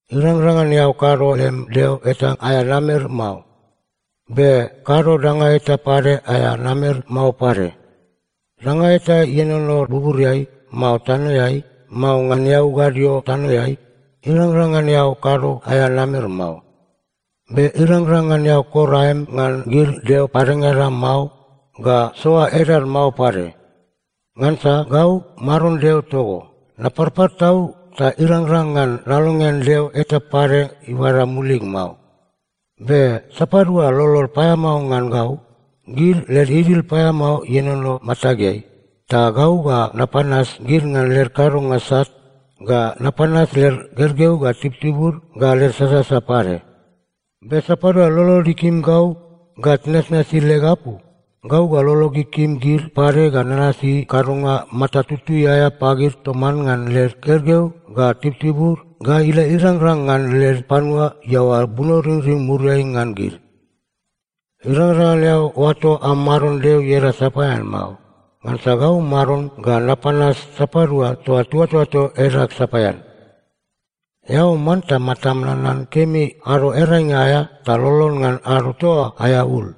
“Irangrang ngan eao kado lem deo eta aea namer mao. Be kado danga eta pade aea namer mao pade. Danga eta ienono buburiai, mao tanoeai, mao ngan eau gadio tanoeai, irangrang ngan eao kado aea namer mao. Be irangrang ngan eao kor aem ngan gid deo padengada mao ga soa edad mao pade. Ngansa gau, Maron Deo togo, naparpar tau ta irangrang ngan nalongean deo eta pade ibada mulig mao. Be sapadua lolod paeamao ngan gau, gid led idil paeamao ienono matageai, ta gau ga napanas gid ngan led kadonga sat ga napanas led gergeu ga tibutibud ga led sasasa pade. Be sapadua lolod ikim gau ga tinasnasi leg apu, gau ga lolog ikim gid pade ga nanasi kadonga mata tutui aea pagid toman ngan led gergeu ga tibutibud ga ila irangrang ngan led panua iaoa bunoringring muriai ngan gid. “Irangrang ngan eao oato am Maron Deo ieda sapaean mao. Ngansa gau Maron ga napanas sapadua toa tiuatoato edag sapaean. “Eao manta matam nanan kemi Ado Earainga aea ta lolon ngan ado toa oa aea ul.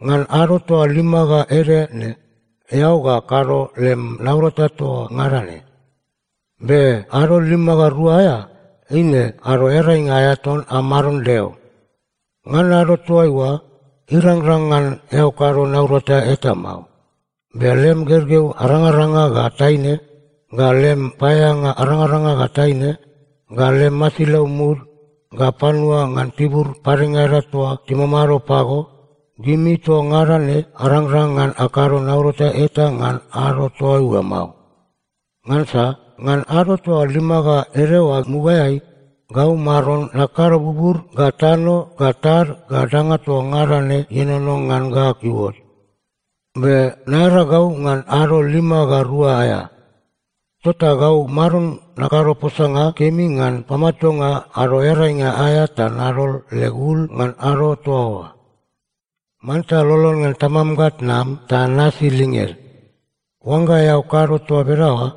Ngan ado toa lima ga ede ne, eao ga kado lem naurata toa ngada ne. Be ado lima ga rua aea, eine Ado Earainga aea ton am Maron Deo. Ngan ado toaiua, irangrang ngan eao kado naurata eta mao. Be lem gergeu arangaranga ga taine, ga lem paeaeanga arangaranga ga taine, ga lem masilau mud, ga panua ngan tibur padengada toa timamado pago, gimi toa ngada ne arangrang ngan akado naurata eta ngan ado toaiua mao. Ngansa ngan ado toa lima ga ede oa mugaeai, gau Maron nakado bubur ga tano ga tad ga danga toa ngada ne ienono ngan ga iuot. Be naearagau ngan ado lima ga rua aea. Tota gau Maron nakado posanga kemi ngan pamatuanga Ado Earainga aea ta nadol leg ul ngan ado toa oa. “Manta lolon ngan tamam ga tnam ta nasi linged. Oangga eao kado toa bedaoa,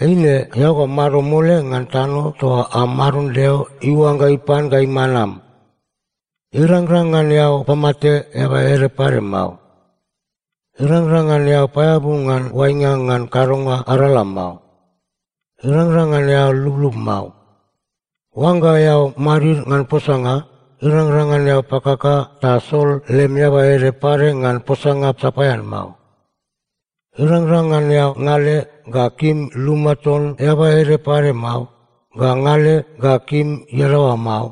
eine eao ga mamado mole ngan tano toa am Maron Deo iuangga ipan ga iman am. “Irangrang ngan eao pamate eaba ede pade mao. “Irangrang ngan eao paeabu ngan oainga ngan kadonga arala mao. “Irangrang ngan eao lublub mao. “Oangga eao madid ngan posanga, irangrang ngan eao pakaka ta sol lem eaba ede pade ngan posanga sapaean mao. “Irangrang ngan eao ngale ga kim luma ton eaba ede pade mao, ga ngale ga kim iadaoa mao,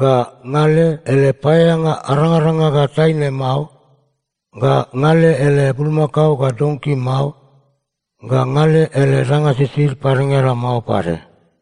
ga ngale ele paeaeanga arangaranga ga taine mao, ga ngale ele bulmakao ga donki mao, ga ngale ele danga sisid padengada mao pade.”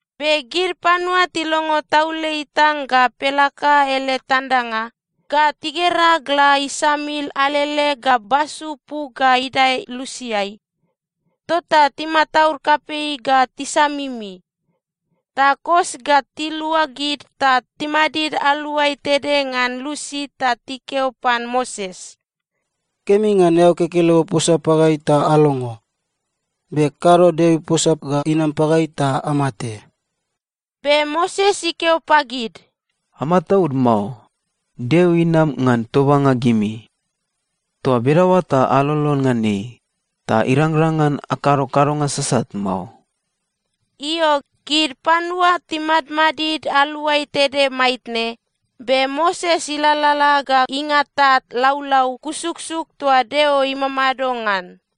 Be gid panua tilongo taule itang ga pelaka ele tandanga, ga tigera gla isamil alele ga basu puk ga idae lusiai, tota timataud kapei ga tisamimi. Ta kos ga tiluagid ta timadid aluai tede ngan lusi ta tikeo pan Moses, “Kemi ngan eao kekelego posa pagai ta alongo. Be kado Deo iposa ga inam pagai ta amate.” Be Moses ikeo pagid, “Amataud mao. Deo inam ngan tobanga gimi. Toa bedaoa ta alolon ngan ei, ta irangrang ngan akado kadonga sasat mao.” Io, gid panua timadmadid aluai tede maitne, be Moses ilalala ga ingata laulau kusuksuk toa Deo imamado ngan.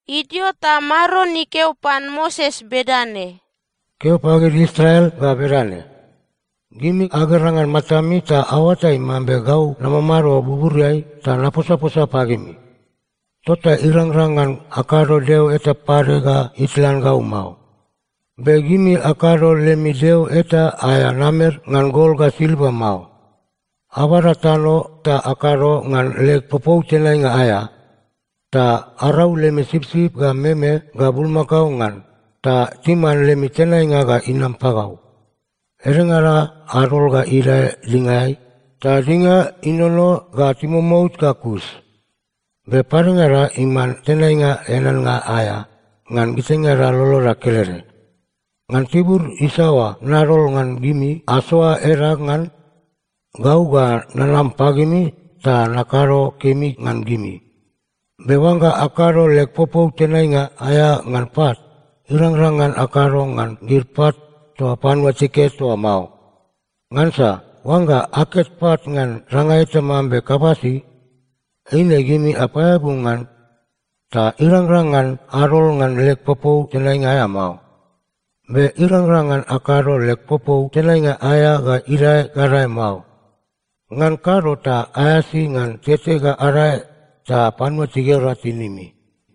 Idio ta Maron ikeo pan Moses bedane, “Keo pagid panua Israel ga bedane, ‘Gimi agera ngan matami ta aoatai mambe gau namamado buburiai ta naposaposa pagimi. Tota irangrang ngan akado deo eta pade ga itlan gau mao. Be gimi akado lemi deo eta aea namer ngan gol ga silva mao. “‘Abada tano ta akado ngan leg popou tenainga aea, ta arau lemi sipsip ga meme ga bulmakao ngan, ta timan lemi tenainga ga inam pagau. Edengada adol ga idae dingaeai, ta dinga inono ga timomout ga kus, be padengada iman tenainga eaneannga aea ngan gitaingada loloda kelede. Ngan tibur isaoa nadol ngan gimi asoa edag ngan, gau ga nanam pagimi ta nakado kemi ngan gimi. Be oangga akado leg popou tenainga aea ngan pat, irangrang ngan akado ngan gid pat toa panua tiket oa mao. Ngansa oangga aket pat ngan danga eta mambe kabasi, eine gimi apaeabu ngan, ta irangrang ngan adol ngan leg popou tenainga aea mao. Be irangrang ngan akado leg popou tenainga aea ga idae gadae mao. Ngan kado ta aeasi ngan tete ga adae ta panua tigera tinimi.’”